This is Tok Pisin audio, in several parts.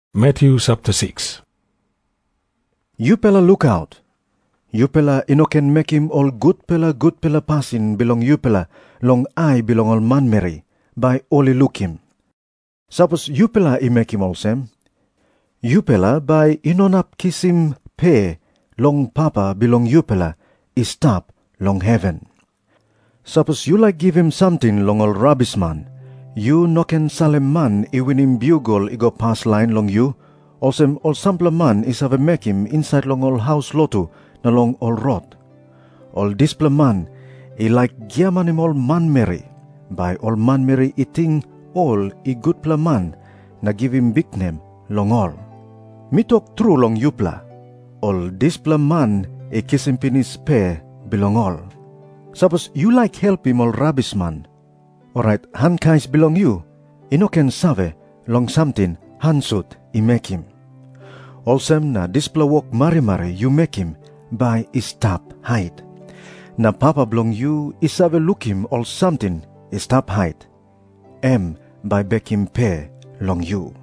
Jisas i tok moa olsem, "Yupela lukaut. Yupela i no ken mekim ol gutpela gutpela pasin bilong yupela long ai bilong ol manmeri, bai ol i lukim. Sapos yupela i mekim olsem, yupela bai i no inap kisim pe long Papa bilong yupela i stap long heven. "Sapos yu laik givim samting long ol rabisman, yu no ken salim man i winim biugel i go paslain long yu olsem ol sampela man i save mekim insait long ol haus lotu na long ol rot. Ol dispela man i laik giamanim ol manmeri, bai ol manmeri i ting ol i gutpela man na givim biknem long ol. Mi tok tru long yupela, ol dispela man i kisim pinis pe bilong ol. Sapos yu laik helpim ol rabisman, orait han kais bilong yu i no ken save long samting han sut i mekim. Olsem na dispela wok marimari yu mekim bai i stap hait. Na Papa bilong yu i save lukim ol samting i stap hait, em bai i bekim pe long yu."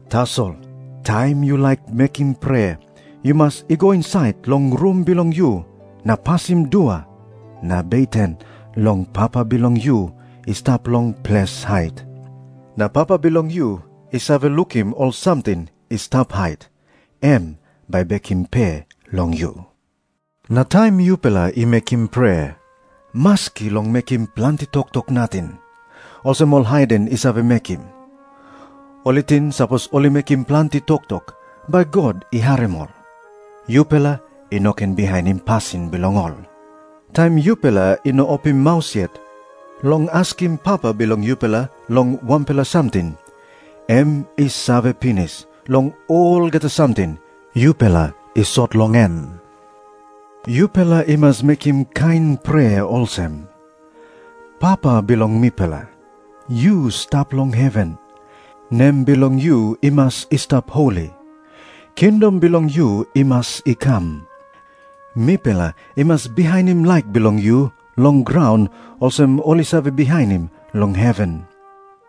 Tasol taim yu laik mekim prea, yu mas i go insait long rum bilong yu na pasim dua na beten long Papa bilong yu i stap long ples hait. Na Papa bilong yu i save lukim ol samting i stap hait, em bai i bekim pe long yu. "Na taim yupela i mekim prea, maski long mekim planti toktok nating, olsem ol haiden i save mekim. Ol i ting sapos ol i mekim planti toktok bai God i harim ol. Yupela i no ken bihainim pasin bilong ol. Taim yupela i no opim maus yet long askim Papa bilong yupela long wanpela samting, em i save pinis long olgeta samting yupela i sot long en. "Yupela i mas mekim kain prea olsem, 'Papa bilong mipela, yu stap long heven, nem bilong yu i mas i stap holi. Kingdom bilong yu i mas i kam. Mipela i mas bihainim laik bilong yu long graun olsem ol i save bihainim long heven.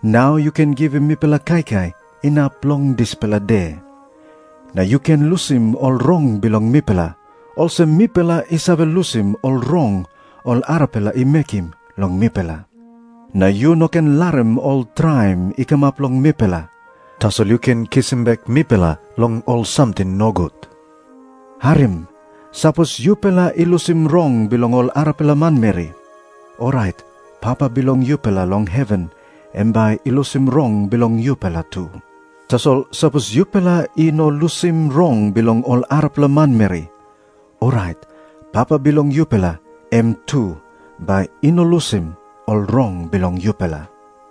Nau yu ken givim mipela kaikai inap long dispela de. Na yu ken lusim ol rong bilong mipela, olsem mipela i save lusim ol rong ol arapela i mekim long mipela. Na yu no ken larim ol traim i kamap long mipela, tasol yu ken tekewe mipela long ol samting nogut.' "Harim. Sapos yupela i lusim rong bilong ol arapela manmeri, orait Papa bilong yupela long heven em bai i lusim rong bilong yupela tu. Tasol sapos yupela i no lusim rong bilong ol arapela manmeri, orait Papa bilong yupela em tu bai i no lusim ol rong bilong yupela."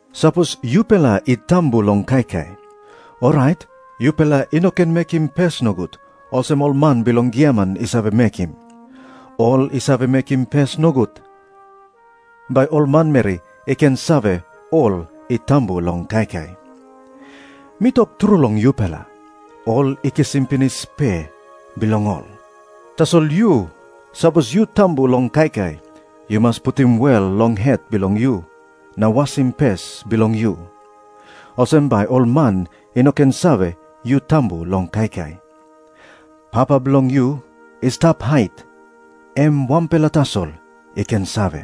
Jisas i tok moa olsem, "Sapos yupela i tambu long kaikai, orait yupela i no ken mekim pes nogut olsem ol man bilong giaman i save mekim. Ol i save mekim pes nogut, bai ol manmeri i ken save ol i tambu long kaikai. Mi tok tru long yupela, ol i kisim pinis pe bilong ol. Tasol yu, sapos yu tambu long kaikai, yu mas putim wel long het bilong yu na wasim pes bilong yu. Olsem bai ol man i no ken save yu tambu long kaikai. Papa bilong yu i stap hait, em wanpela tasol i ken save.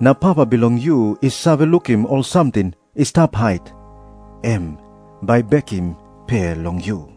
Na Papa bilong yu i save lukim ol samting i stap hait, em bai i bekim pe long yu."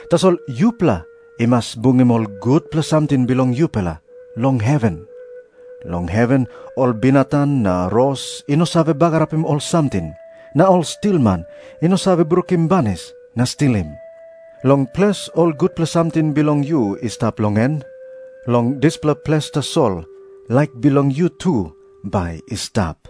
Tasol yupela i mas bungim ol gutpela samting bilong yupela long heven. Long heven ol binatang na ros i no save bagarapim ol samting, na ol stilman i no save brukim banis na stilim. Long ples ol gutpela samting bilong yu i stap long en, long dispela ples tasol laik bilong yu tu bai i stap."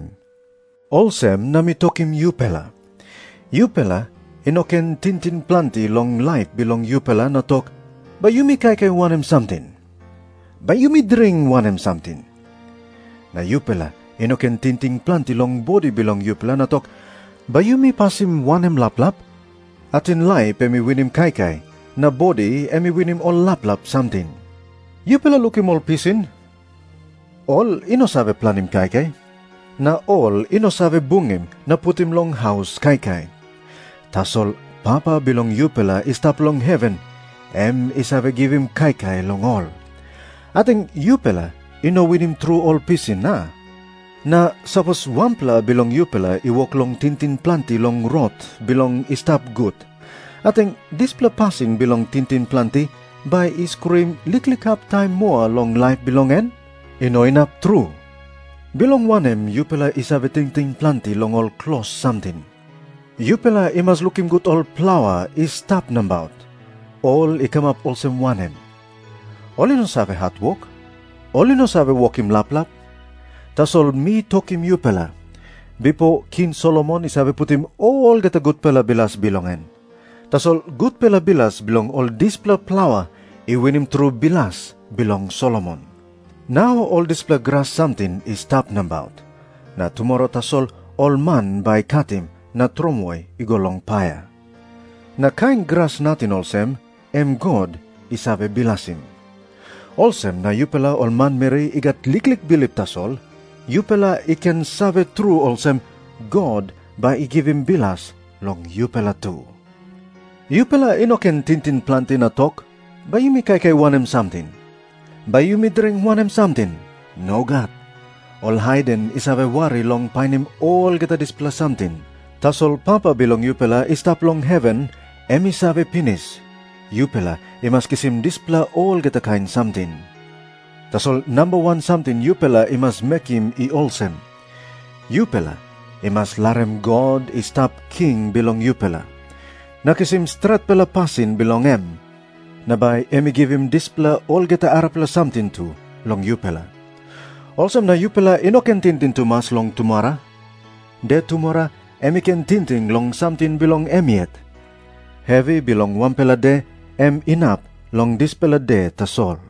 Jisas i tok moa olsem, "Olsem na mi tokim yupela, yupela i no ken tingting planti long laip bilong yupela na tok, 'Bai yumi kaikai wanem samting? Bai yumi dring wanem samting?' Na yupela i no ken tingting planti long bodi bilong yupela na tok, 'Bai yumi pasim wanem laplap?' Ating laip em i winim kaikai, na bodi em i winim ol laplap samting. Yupela lukim ol pisin. Ol i no save planim kaikai, na ol i no save bungim na putim long haus kaikai. Tasol Papa bilong yupela i stap long heven em i save givim kaikai long ol. Ating yupela i no winim tru ol pisin, a? Na sapos wanpela bilong yupela i wok long tingting planti long rot bilong i stap gut, ating dispela pasin bilong tingting planti bai i skruim liklik hap taim moa long laip bilong en? I no inap tru. "Bilong wanem yupela i save tingting planti long ol klos samting? Yupela i mas lukim gut ol plaua i stap nabaut, ol i kamap olsem wanem. Ol i no save hatwok. Ol i no save wokim laplap. Tasol mi tokim yupela, bipo King Solomon i save putim olgeta gutpela bilas bilong en, tasol gutpela bilas bilong ol dispela plaua i winim tru bilas bilong Solomon. Nau ol dispela gras samting i stap nabaut, na tumora tasol ol man bai i katim na tromoi i go long paia. Na kain gras nating olsem, em God i save bilasim. Olsem na yupela ol manmeri i gat liklik bilip tasol, yupela i ken save tru olsem, God bai i givim bilas long yupela tu. Yupela i no ken tingting planti na tok, 'Bai yumi kaikai wanem samting? Bai yumi dring wanem samting?' Nogat. Ol haiden i save wari long painim olgeta dispela samting. Tasol Papa bilong yupela i stap long heven em i save pinis, yupela i mas kisim dispela olgeta kain samting. Tasol namba wan samting yupela i mas mekim i olsem. Yupela i mas larim God i stap king bilong yupela, na kisim stretpela pasin bilong em, na bai em i givim dispela olgeta arapela samting tu long yupela. Olsem na yupela i no ken tingting tumas long tumora. De tumora em i ken tingting long samting bilong em yet. Hevi bilong wanpela de em inap long dispela de tasol."